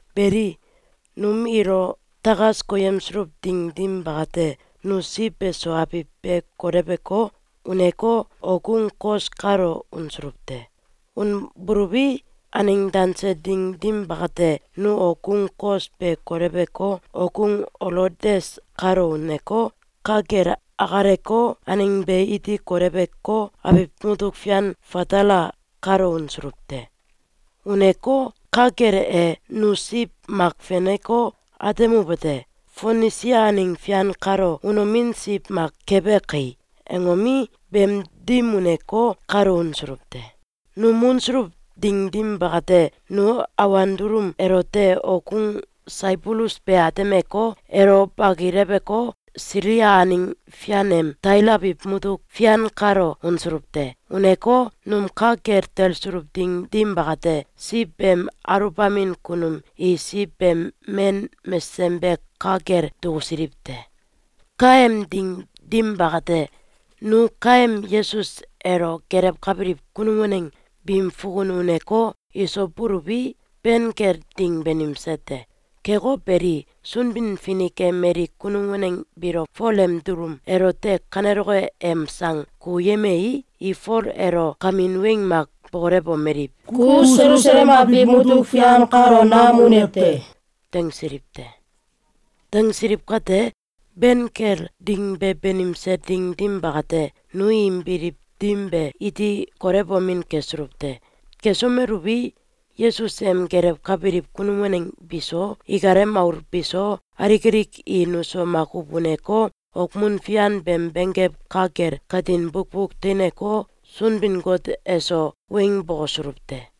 Beli, num ilo takas koyemsuluw ding dim bakate, nu siw beso abiw be koleweko, uneko, okgung Kos kalo unsuluw te. Unbuluwi, aneng danse ding dim bakate, nu okgung Kos be koleweko, okgung Olodes kalo uneko, ka kel akaleko, aneng be iti koleweko, abiw mutuk fian Fatala kalo unsuluw te. Uneko, ka kel e, nu siw mak feneko, atemuwete: “Fonisia aneng fian kalo unomin siw mak kebe kai!”, angomi, beem dim uneko, kalo unsuluw te. Num unsuluw ding dim bakate, nu awan dulum elote okgung Saibulus be atemeko, elo bakileweko, Silia aneng fian em Tail abiw mutuk fian kalo unsuluw te. Uneko, num ka kel talsuluw ding dim bakate, siw beem aluwbamin kunum i siw beem men mesesem be ka kel dukusiliw te. Kaem ding dim bakate, nu kaem Yesus elo gelewkabiliw kunum waneng biim fukun uneko, iso buluwi, ben kel ding banimse te. Keko beli, Sunbin-Finik e mali kunum waneng biilo Fol em dulum elote kaneloke em sang kukuyemei, i Fol elo kamin weng mak bokolewomeliw: “Ku Selusalem abiw mutuk fian kalo nam unew te!”, dangsiliw te. Dangsiliw kate, ben kel ding be banimse ding dim bakate, nu im biliw dim be iti kolewomin kesuluw te. Kesomeluwi, Yesus em gelewkabiliw kunum waneng biso, ikalem aul biso, alik alik i nuso makuw uneko, okmun fian beem benggew ka kel katin bukbuk teineko, Sunbin-Got eso weng bokosuluw te.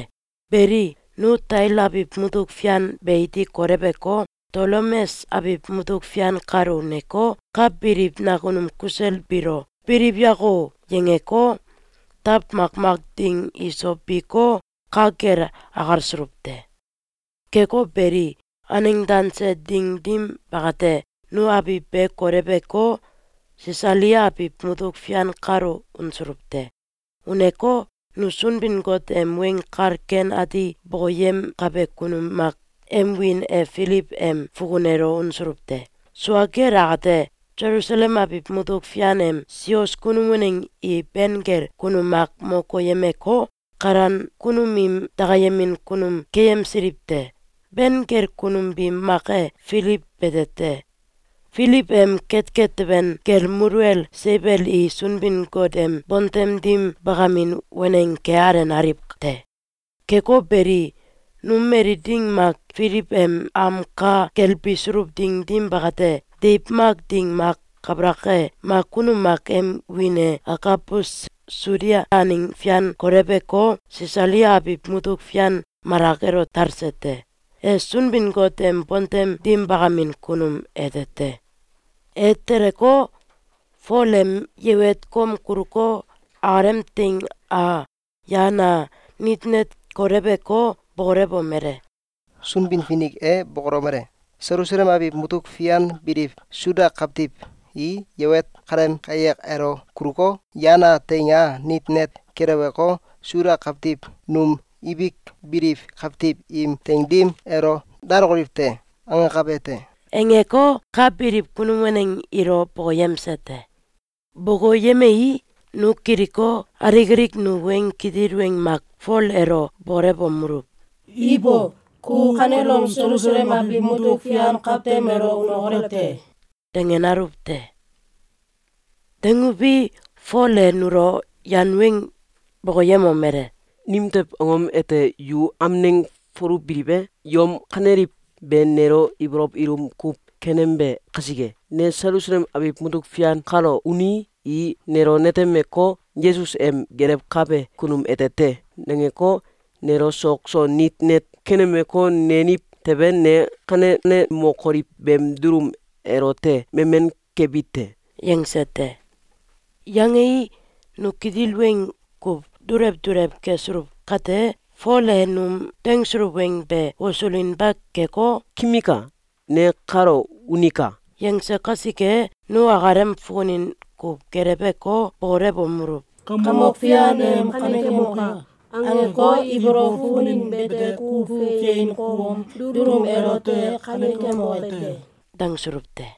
Beli, nu Tail abiw mutuk fian be iti koleweko, Tolemes abiw mutuk fian kalo uneko, ka biliw nakunum kusel biilo “Biliw yako!”, yangeko, taw makmak ding iso biko, ka kel akalsuluw te. Keko beli, aneng danse ding dim bakate, nu abiw be koleweko, Sisalia abiw mutuk fian kalo unsuluw te. Uneko, nu Sunbin-Got em Weng Kal Ken Ati bokoyemkabe kunum mak em wiin e Filiw em fukun elo unsuluw te. Sua kel akate, Selusalem abiw mutuk fian em sios kunum waneng i ben kel kunum mak mo koyemeko, kalan kunum im dakayemin kunum keyemsiliw te. Ben kel kunum biim mak e Filiw bete te. Filiw em ketket teben kel muluwel seiwel i Sunbin-Got em bontem dim bakamin waneng ke alenaliw te. Keko beli, num mali ding mak Filiw em am ka kel bisuluw ding dim bakate, deiw mak ding mak kabalak e, mak kunum mak em wiin e Agabus Sudia aneng fian koleweko, Sisalia abiw mutuk fian malak elo talse te. E Sunbin-Got em bontem dim bakamin kunum ete te. E teleko, Fol em yewet kom kuluko, akalem teing a, yan a, nit net koleweko, bokolomele: “Sunbin-Finik e bokolomele: ‘Selusalem abiw mutuk fian biliw Suda kawtiw i yewet kaleem kayak elo kuluko, yan a, teing a, nit net keleweko, Suda kawtiw num ibik biliw kawtiw im teing dim elo dalokoliw te.’, angakabe te.”, angeko, ka biliw kunum waneng ilo bokoyemse te. Bokoyemei, nu kiliko, alik alik nu weng kitil weng mak Fol elo bokolewomeluw: “Ibo! Ku kanelom Selusalem abiw mutuk fian kawtem elo unokolew te!”, dangenaluw te. Danguwi, Fol e nulo yan weng bokoyemomele: “Nimtew angom ete yu amneng foluwbiliw e? Yom kaneliw be nelo ibolow ilum kuw kenembe kasike. Ne Selusalem abiw mutuk fian kalo unii, i nelo netemeko, ‘Yesus em gelewkabe kunum ete te!’, nangeko, nelo sok so nit net kenemeko, neniw tewe, ne kanenemokoliw beem dulum elote memen kebi te.”, yangse te. Yangei, nu kitil weng kuw dulew dulew kesuluw kate, Fol e num dangsuluw weng be wosulinba keko, “Kimika! Ne kalo unika!”, yangse kasike, nu akalem fukunin kuw geleweko, bokolewomeluw: “Kamok Fian em ‘Kanekemoka!’, angeko, ibolow fukunin bete kuw fein kom dulum elote kanekemoke te!”, dangsuluw te.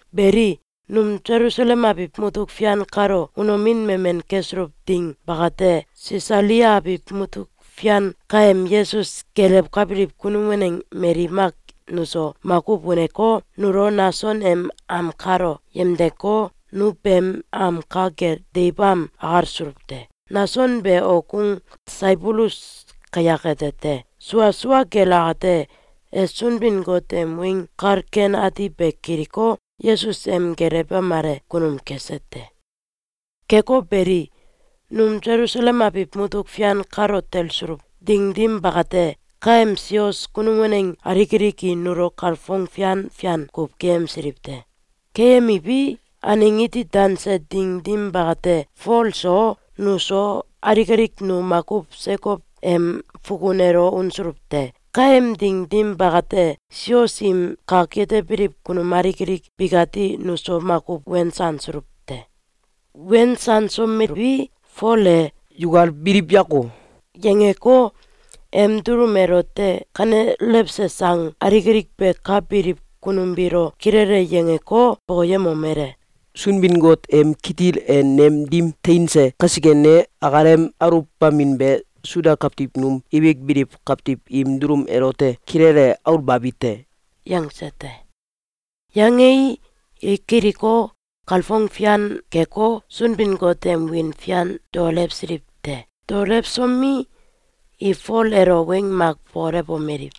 Beli, num Selusalem abiw mutuk fian kalo unomin memen kesuluw ding bakate, Sisalia abiw mutuk fian kaem Yesus gelewkabiliw kunum waneng mali mak nuso makuw uneko, nulo Nason em am kalo yemdeko, nu beem am ka kel deiw am akalsuluw te. Nason be okgung Saibulus kayak ete te. Sua sua kel akate, e Sunbin-Got em Weng Kal Ken Ati be kiliko, Yesus em gelewemale kunum kese te. Keko beli, num Selusalem abiw mutuk fian kalo talsuluw ding dim bakate, kaem sios kunum waneng alik alik i nulo kalfong fian fian kuw keyemsiliw te. Keyemiwi, aneng iti danse ding dim bakate, Fol so, nuso, alik alik nu makuw Sekow em fukun elo unsuluw te. Kaem ding dim bakate, sios im kak yetebiliw kunum alik alik bikati nuso makuw wensansuluw te. Wensansomeluwi, Fol e “Yukal biliw yako!”, yangeko, em dulum elote kanelewse sang alik alik be ka biliw kunum biilo kilele yangeko, bokoyemomele: “Sunbin-Got em kitil e nem dim teinse kasike, ne akalem aluwbamin be Suda kawtiw num ibik biliw kawtiw im dulum elote kilele aulbabi te.”, yangse te. Yangei, i kiliko, kalfong fian keko, Sunbin-Got em wiin fian daolewsiliw te. Daoelwsomi, i Fol elo weng mak bokolewomeliw: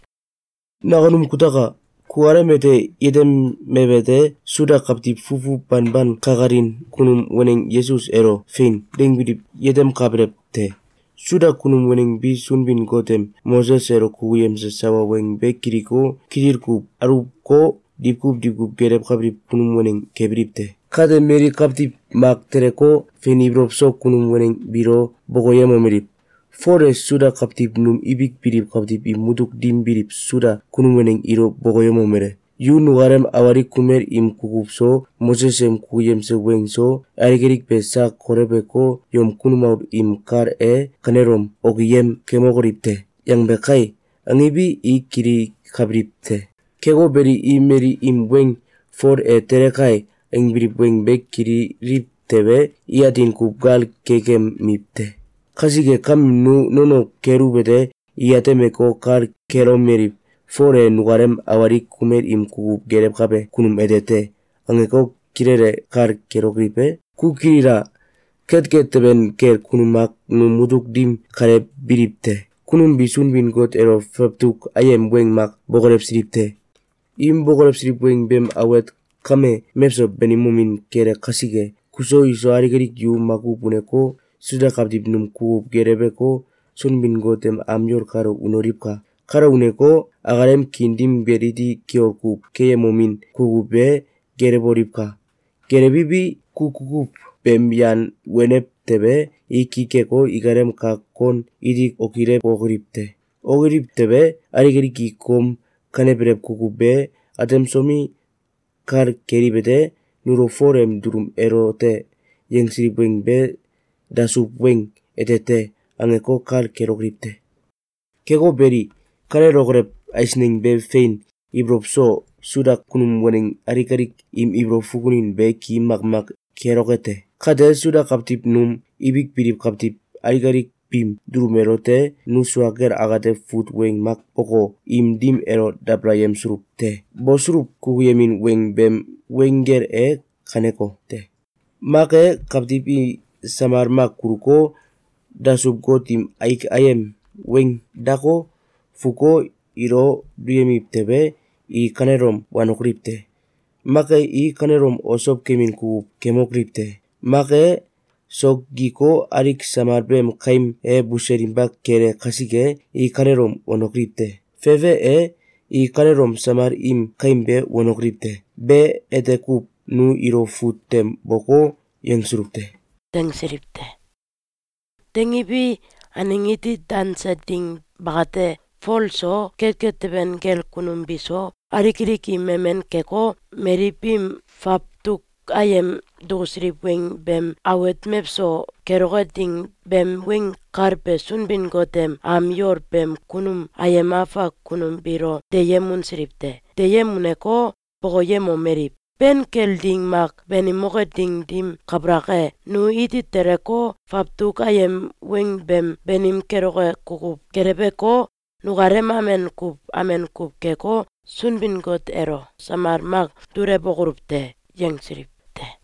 “Nakunum kutaka! Kukalem ete yetemewete: Suda kawtiw fufu banban kakalin kunum waneng Yesus elo “Fein!”, dangbiliwi, yetemkabelew te. Suda kunum waneng bi Sunbin-Got em Moses elo kukuyemse sawa weng be kiliko, kitil kuw aluwko, diwkuw diwkuw gelewkabiliw kunum waneng kebiliw te. Kate, mali kawtiw mak teleko, fein ibolow so kunum waneng biilo bokoyemomeliw: ‘Fol e Suda kawtiw num ibik biliw kawtiw im mutuk dim biliw Suda kunum waneng ilo bokoyemomele: ‘Yu nukalem awalik kumel im kukuw so, Moses em kukuyemse weng so, alik alik be sak koleweko, yom kunum aul im kal e kanelom okiyem kemokoliw te!’, yangbe kai!’, angiwi, i kilikabiliw te. Keko beli, i mali im weng ‘Fole e tele kai!’, angbiliw weng be kililiw tewe, i atin kuw gal kekemiw te. Kasike kame, nu nono keluwete, i atemeko, kal kelomeliw: ‘Fol e nukalem awalik kumel im kukuw gelewkabe kunum ete te!’, angeko, kilele kal kelokoliw e? Ku kilila! Ketket teben kel kunum mak num mutuk dim kale biliw te. Kunum bi Sunbin-Got elo fawtuk ayem weng mak bokolewsiliw te. Im bokolewsiliw weng beem awet kame mewso banimomin kele kasike, kuso, iso, alik alik yu makuw uneko, Suda kawtiw num kukuw geleweko, Sunbin-Got em am yol kalo unoliwka! Kalo uneko, akalem kiin dim kel iti kiol kuw keyemomin kukuw be gelewoliwka! Gelewiwi, ku kukuw beem yan wenew tewe, i ki keko, ikalem kak kon iti okilewokoliw te. Okiliw tewe, alik alik i kom kanebelew kukuw be atemsomi, kal keliwete: ‘Nulo Fol em dulum elote yangsiliw weng be dasuw weng ete te.’, angeko, kal kelokoliw te. Keko beli, kanelokolew eisneng be fein ibolow so Suda kunum waneng alik alik im ibolow fukunin be ki makmak keloke te. Kate, Suda kawtiw num ibik biliw kawtiw alik alik biim dulum elote nu sua kel akate fut weng mak boko, im dim elo dabalayemsuluw te. Bosuluw kukuyemin weng beem weng gel e kanekote: ‘Mak e, kawtiw i samal mak kuluko, dasuw-got im aik ayem weing dako, fuko, ilo duyemiw tewe, i kanelom wanokoliw te! Mak e, i kanelom osow kemin kukuw kemokoliw te! Mak e, sok giko, aliw samal beem kaim e buselinba kele kasike, i kanelom wanokoliw te! Fefe e, i kanelom samal im kaim be wanokoliw te!’, be ete kuw nu ilo fut tem boko, yangsuluw te.”, dangsiliw te. Dangiwi, aneng iti danse ding bakate, Fol so, ketet teben kel kunum biso, alik alik i memen keko, mali biim fawtuk ayem dukusiliw weng beem awet mewso keloke ding beem weng kal be Sunbin-Got em am yol beem kunum ayem afak kunum biilo deyem unsiliw te. Deyem uneko, bokoyemomeliw: “Ben kel ding mak banimoke ding dim kabalak e, nu iti teleko, fawtuk ayem weng beem banim keloke kukuw geleweko, nukalem amen kuw amen kuw keko, Sunbin-Got elo samal mak dulewokoluw te.”, yangsiliw te.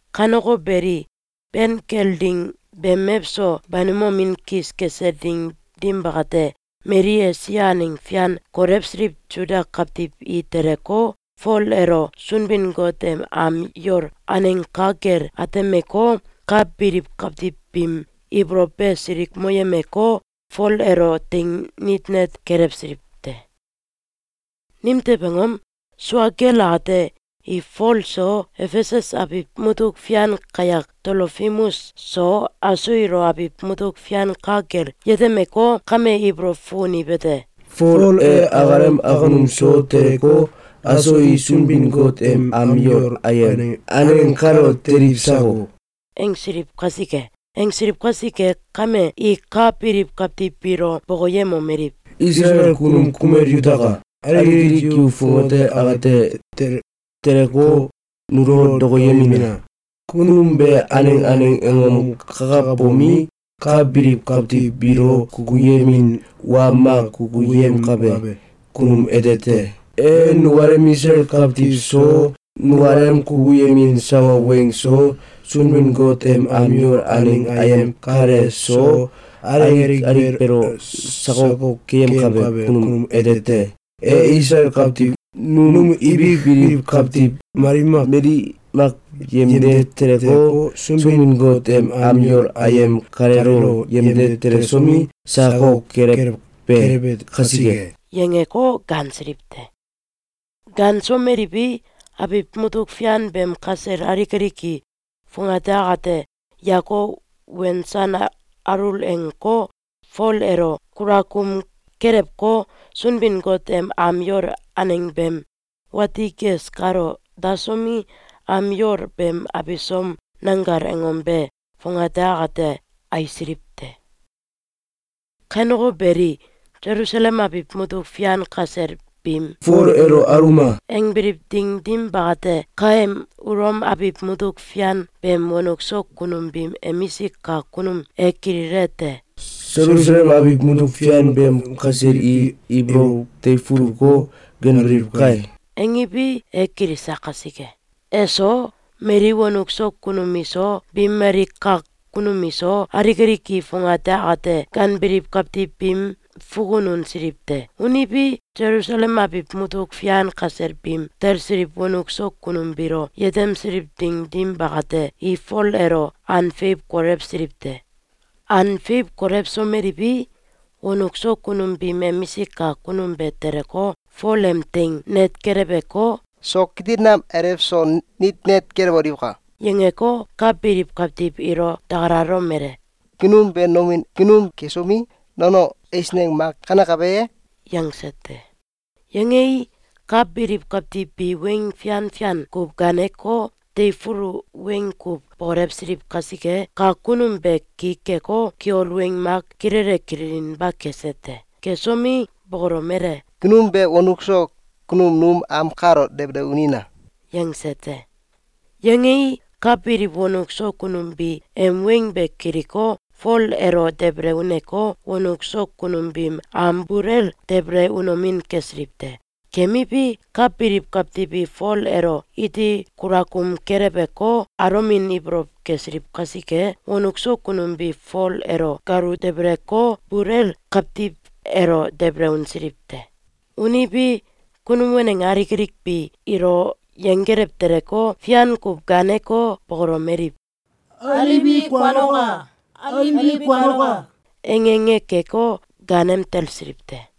Kaneko beli, ben kel ding beem mewso banimomin kis kese ding dim bakate, mali Esia aneng fian kolewsiliw Suda kawtiw i teleko, Fol elo Sunbin-Got em am yol aneng ka kel atemeko, ka biliw kawtiw biim ibolow be silikmoyemeko, Fol elo teing nit net kelewsiliw te. Nimtew angom? Sua kel akate, i Fol so, Efesus abiw mutuk fian kayak Tolofimus so, aso ilo abiw mutuk fian ka kel yetemeko, kame ibolow fukuniwete: “Fol e akalem akunum so teleko, aso i Sunbin-Got em am yol ayem aneng kalo teliw sako!”, angsiliw kasike. Angsiliw kasike kame, i ka biliw kawtiw biilo bokoyemomeliw: “Isalael kunum kumel yutaka! Alik alik yu fongate akate teleko, nulo dokoyemina! Kunum be aneng aneng angom kakabomi, ka biliw kawtiw biilo kukuyemin wa mak kukuyemkabe kunum ete te. E nukalem Isalael kawtiw so, nukalem kukuyemin sawa weng so, Sunbin-Got em am yol aneng ayem kale so, alik alik beelo sakok keyemkakabe kunum ete te. E Isalael kawtiw num ibik biliw kawtiw mali mak yemde teleko, Sunbin-Got em am yol ayem kaleelo yemde telesomi, sakok kelewbe kasike.”, yangeko gaansiliw te. Gaansomeliwi, abiw mutuk fian beem kasel alik alik i fongate akate yako wensan alul angeko, Fol elo kulakum kelewko, Sunbin-Got em am yol aneng beem wati ges kalo dasomi, am yol beem abisom nanggal angom be fongate akate aisiliw te. Kaneko beli, Selusalem abiw mutuk fian kasel biim “Fol elo aluma!”, angbiliw ding dim bakate, kaem Ulom abiw mutuk fian beem wonuk so kunum biim emisik kak kunum e kililete: “Selusalem abiw mutuk fian beem kasel i ibolow teifuluko, ganbiliw kai!”, angiwi, e kilise kasike, eso, mali wonuk so kunum iso, biim mali kak kunum iso, alik alik i fongate akate ganbiliw kawtiw biim fukun unsiliw te. Uniwi, Selusalem abiw mutuk fian kasel biim talsiliw wonuk so kunum biilo yetemsiliw ding dim bakate, i Fol elo an feiw kolewsiliw te. An feiw kolewsomeliwi, wonuk so kunum biim emisik kak kunum be teleko, Fol em teing net keleweko, “Sok kitil nam alew so nit net kelewoliwka!”, yangeko, ka biliw kawtiw ilo dakalalomele: “Kunum be nomin kunum kesomi, nono eisneng mak kanekabe ye?”, yangse te. Yangei, ka biliw kawtiw bi weng fian fian kuw gaaneko, teifulu weng kuw bokolewsiliw kasike, kak kunum be ki keko, kiol weng mak kilele kililinba kese te. Kesomi, bokolomele: “Kunum be wonuk so kunum num am kalo debele unina!”, yangse te. Yangei, ka biliw wonuk so kunum bi em weng be kiliko, Fol elo debele uneko, wonuk so kunum biim am bul el debele unomin kesiliw te. Kemiwi, ka biliw kawtiw i Fol elo iti kulakum keleweko, alomin ibolow kesiliw kasike, wonuk so kunum bi Fol elo galu debeleko, bul el kawtiw elo debele unsiliw te. Uniwi, kunum waneng alik alik bi ilo yenggelew teleko, fian kuw gaaneko, bokolomeliw: “Aliwi, kuanoka! Aliwi, kuanoka!”, ange ange keko, gaanem talsiliw te.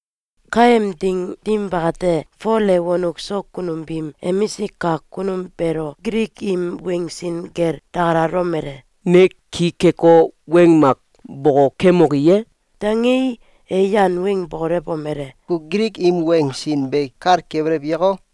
Kaem ding dim bakate, Fol e wonuk so kunum biim emisik kak kunum beelo Gilik im weng sin kel dakalalomele: “Ne ki keko, weng mak bokokemoki ye?”, dangei, e yan weng bokolewomele: “Ku Gilik im weng sin be kal kebelew yako?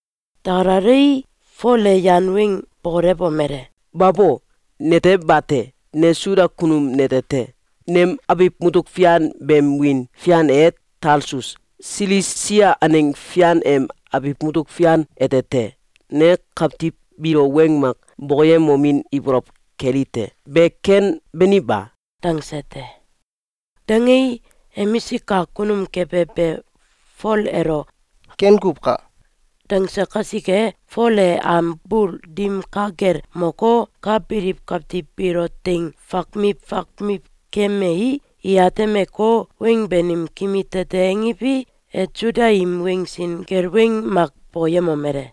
Dakalalei, Fol e yan weng bokolewomele: “Babo! Nete bate. Ne Suda kunum nete te. Nem abiw mutuk fian beem wiin fian e Talsus, Silisia aneng fian em abiw mutuk fian ete te. Ne kawtiw biilo weng mak bokoyemomin ibolow keli te. Be ken, bani ba?”, dangse te. Dangei, emisik kak kunum kebe be Fol elo “Ken kuw ka!”, dangse kasike, Fol e am bul dim ka kel moko, ka biliw kawtiw biilo teing fakmiw fakmiw keyemei, i atemeko, weng banim kimi tete angiwi, e Suda im weng sin kel weng mak bokoyemomele: